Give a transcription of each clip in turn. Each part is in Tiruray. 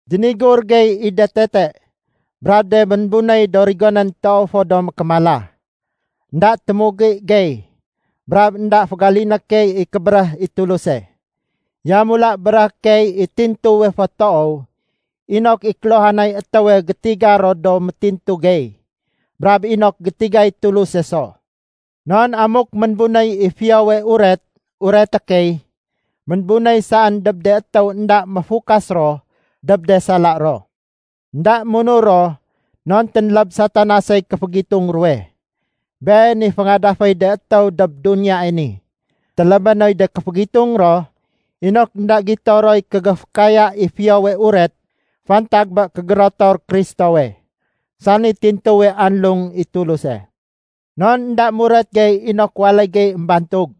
Dénigur gey i de tete brab de ménbunéy do rigonén toow fo do mékémala. Enda témugi gey brab énda fégaliné key i kébéréh i Tuluse. Yamula béréhé key i tintuwe fo toow inok i kéluhanay étéwe gétiga ro do métintu gey, brab inok gétigay Tuluse so. Non amuk ménbunéy i Fiyowe Uret ureté key, ménbunéy saén dob de étéw énda méfukas ro dob de sala ro. Enda munur ro non ténléb Satanasey kéfégitung ruwe. Been i féngadaféy de étéw dob duniyae ni. Télébé noy de kéfégitung ro inok énda gito roy kégéfékaya i Fiyowe Uret fantag bé kégérotor Kristowe, sani tintuwe anlung i Tuluse. Non énda muret gey inok waléy gey émbantug.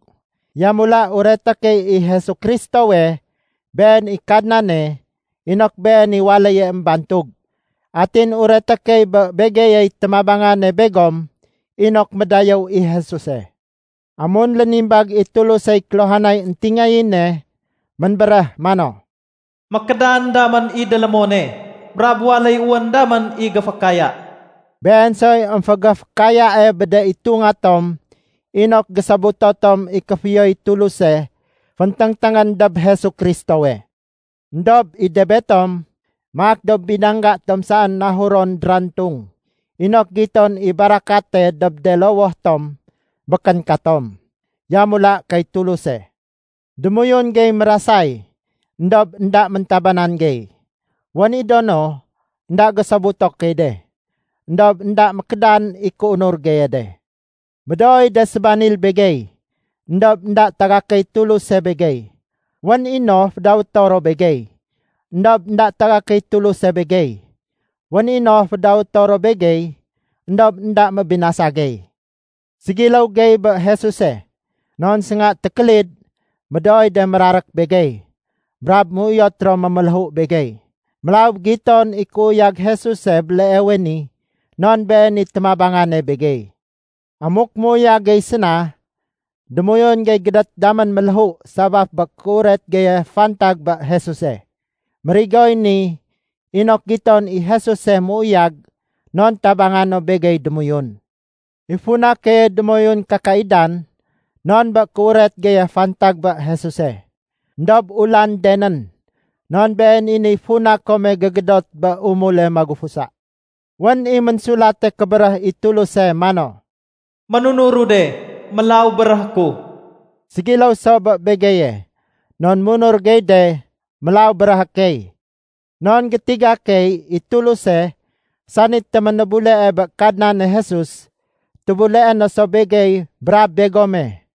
Yamula ureté key i Jesu Kristowe, Been i Kadnane, inok Been i waléye émbantug. Atin ureté key bé begeyey témabangane begom inok médayéw i Jesuse. Amun lénimbag i Tulusey kéluhanay éntingayéne, ménbéréh mano, “Mékédan damén i délémone brab waléy wén damén i géfékaya.” Been soy émfégéfékayae bé de itunga tom inok gésobuto tom i kéfiyoy Tuluse fénténgténgén dob Jesu Kristowe. Endob i de betom, maak do binangga tom saén nahuron drantung inok giton i barakate dob de lowoh tom békén katom, yamula kay Tuluse. Démoyun gey mérasay éndob énda méntabanan gey. Wén i do no, énda gésobuto key de, éndob énda mékédan i kéunur geye de. Médooy de sébanil begey, éndob énda tagakéy Tuluse begey. Wén i no fédawéto ro begey, éndob énda tagakéy Tuluse begey. Wén i no fédawéto ro begey, éndob énda mébinasa gey. Ségiléw gey bé Jesuse non sénga tékélid médooy de mérarék begey, brab méuyot ro méméléhu begey. Mélaw giton i kéuyag Jesuse béleewe ni non Been i témabangane begey. Amuk méuyag gey séna, démoyun gey gédét damén méléhu sabaf bé kéuret geye fantag bé Jesuse. Mérigoy ni inok giton i Jesuse méuyag non tabanga no begey démoyun. I funa keye démoyun kakaidan non bé kéuret geye fantag bé Jesuse. Endob ulandenén, non been i niy funa kome gégédot bé umule magufusa. Wén i Ménsulate Kébéréh i Tuluse mano, “Ménunuru de, mélaw béréhé ku.” Ségiléw so bé begeye, non munur gey de, mélaw béréhé key. Non gétiga key i Tuluse sani téménébulee bé Kadnane Jesus, tébuleé no so begey brab begome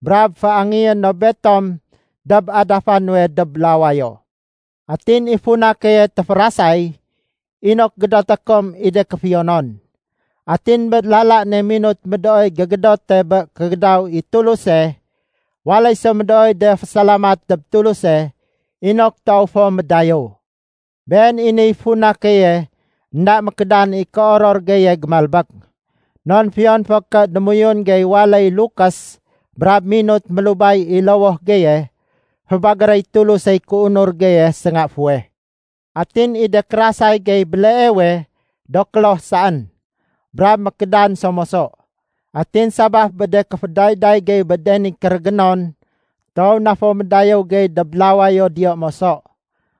brab féangéyé no betom dob adafa nuwe dob lawayo. Atin i funa keye téférasay inok gédoté kom i de kéfiyonon. Atin bé lala ne minut médooy gégédote bé kégédaw i Tuluse, waléy so médooy de fésalamat dob Tuluse inok toow fo médayéw. Been i niy funa keye énda mékédan i kéoror geye gémalbék. Non fiyon fo ké démoyun gey waléy lukés brab minut mélubay i lowoh geye, fébagéréy Tulusey kéunur geye sénga fuweh. Atin i de kérasay gey béleewe do kloh saén brab mékédan so moso. Atin sabaf bé de kéfédayday gey bé de ni kérégénon, toow na fo médayéw gey dob lawayo diyo moso,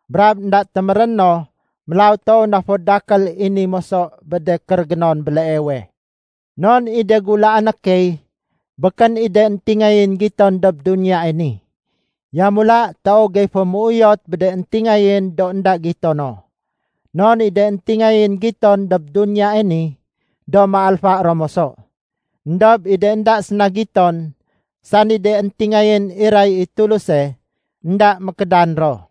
brab énda téméréno Mélaw toow na fo dakél i ni moso bé de kérégénon béleewe. Non i de gulaané key békén i de éntingayén giton dob duniyae ni. Yamula toow gey fo méuyot bé de éntingayén do énda gito no. Non i de éntingayén giton dob duniyae ni, do méalfa ro moso. Endob i de énda séna giton, sani de éntingayén iray i Tuluse, énda mékédan ro.